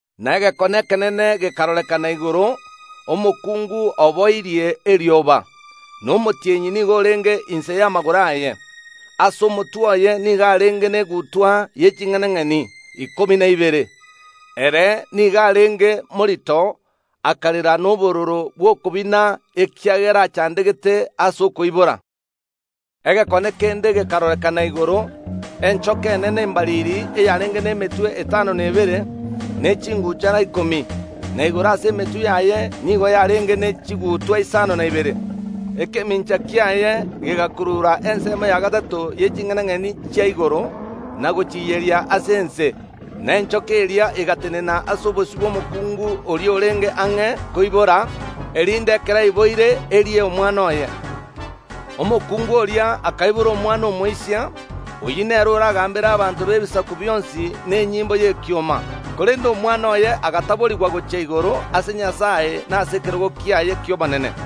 Na egekone ekenene gekarorekana igoro: Omokungu oboirie erioba, na omotienyi nigo orenge inse y’amagoro aye. Ase omotwe oye nigo arenge negutwa ye ching’enang’eni ikomi na ibere. Ere nigo arenge morito, akarera nobororo bw’okobina, ekiagera achandegete ase okoibora. Egekone kende gekarorekana igoro: Enchoka enene embariri eyarenge nemetwe etano na ebere ne ching’unchara ikomi, na igoro ase emetwe yaye nigo yarenge ne chigutwa isano na ibere. Ekemincha kiaye kegakurura ensemo ya gatato ye ching’enang’eni chia igoro na gochiyeria ase ense. Na enchoka eria egatenena ase obosio bw’omokuungu oria orenge ang’e koibora, erinde ekero aiboire erie omwana oye. Omokungu oria akaibora omwana omoisia, oyio nere oragambere abanto b’ebisaku bionsi nenyimbo y’ekioma. Korende omwana oye agataborigwa gochia igoro ase Nyasae na ase ekerogo kiaye ki’obonene.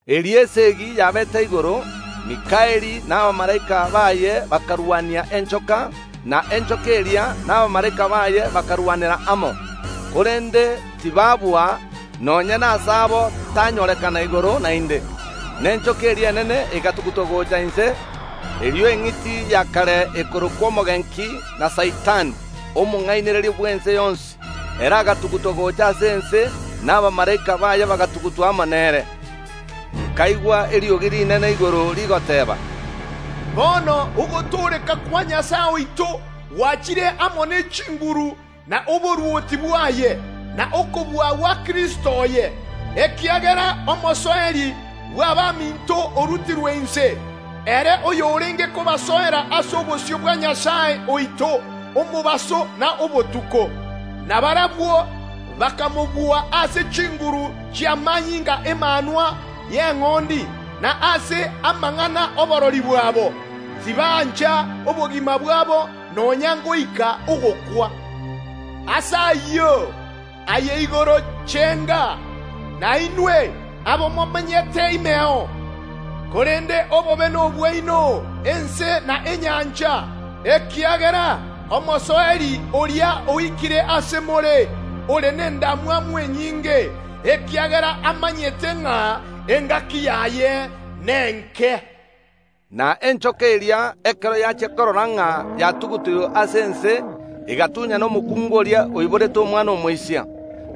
Erio esegi yabeete igoro. Mikaeli na abamalaika baye bakarwania enchoka. Na enchoka eria na abamalaika baye bakarwanera amo, korende tibabua, nonya nase abo tanyorekana igoro naende. Na enchoka eria enene egatugutwa gocha inse. Eria neng’iti ya kare ekorokwa Omogenki na Saitani, omong’ainereria bw’ense yonsi. Ere agatugutwa gocha ase ense, na abamalaika baye bagatugutwa amo nere. Nkaigwa eriogi rinene igoro rigoteeba, “Bono ogotooreka kwa Nyasae oito gwachire amo ne chinguru na oborwoti bwaye, na okobua gwa Kristo oye, ekiagera omosoeri bw’abaminto orutirwe inse, ere oyorenge kobasoera ase obosio bwa Nyasae oito omobaso na obotuko. Na barabwo bakamobua ase chinguru chi’amanyinga ’Emanwa y’Eng’ondi, na ase amang’ana ’oborori bwabo; tibancha obogima bwabo nonya ngoika ogokwa. Ase ayio, aye igoro, chenga, na inwe abamomenyete imeo. Korende obobe nobwaino, ense na enyancha, ekiagera Saitani oikire ase more ore nendamwamu enyinge, ekiagera amanyete ng’a engaki yaye nenke!” Na enchoka eria, ekero yachia korora ng’a yatugutirwe ase ense, egatunyana omokungu oria oiborete omwana omoisia.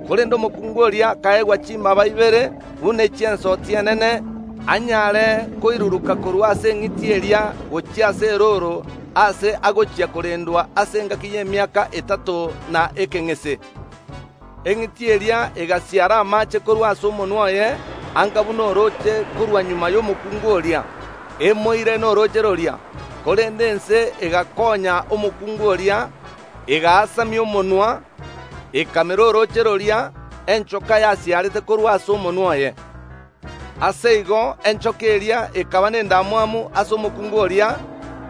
Korende omokungu oria akaegwa chimbaaba ibere buna echi’ekeongo enene, anyare koiruruka korwa ase eng’iti eria gochia ase erooro aase agochia korendwa ase engaki y’emiaka etato na ekeng’ese. Eng’iti eria egasiara amaache korwa ase omonwa oye, anga buna orooche, korwa magega y’omokuungu oria, emoire norooche roria. Korende ense egakoonya omokungu oria, egaasamia omonwa, ekamera orooche roria enchoka yasiarete korwa ase omonwa oye. Ase igo, enchoka eria ekaba nendamwamu ase omokungu oria,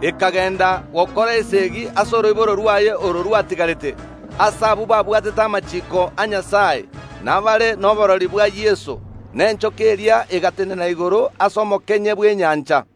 ekagenda gokora esegi ase oroiboro rwaye oro rwatigarete, ase abwo babwatete amachiiko a Nyasae, na bare noborori bwa Yeso. Na enchoka eria egatenena igoro ase omokenye bw’Enyancha.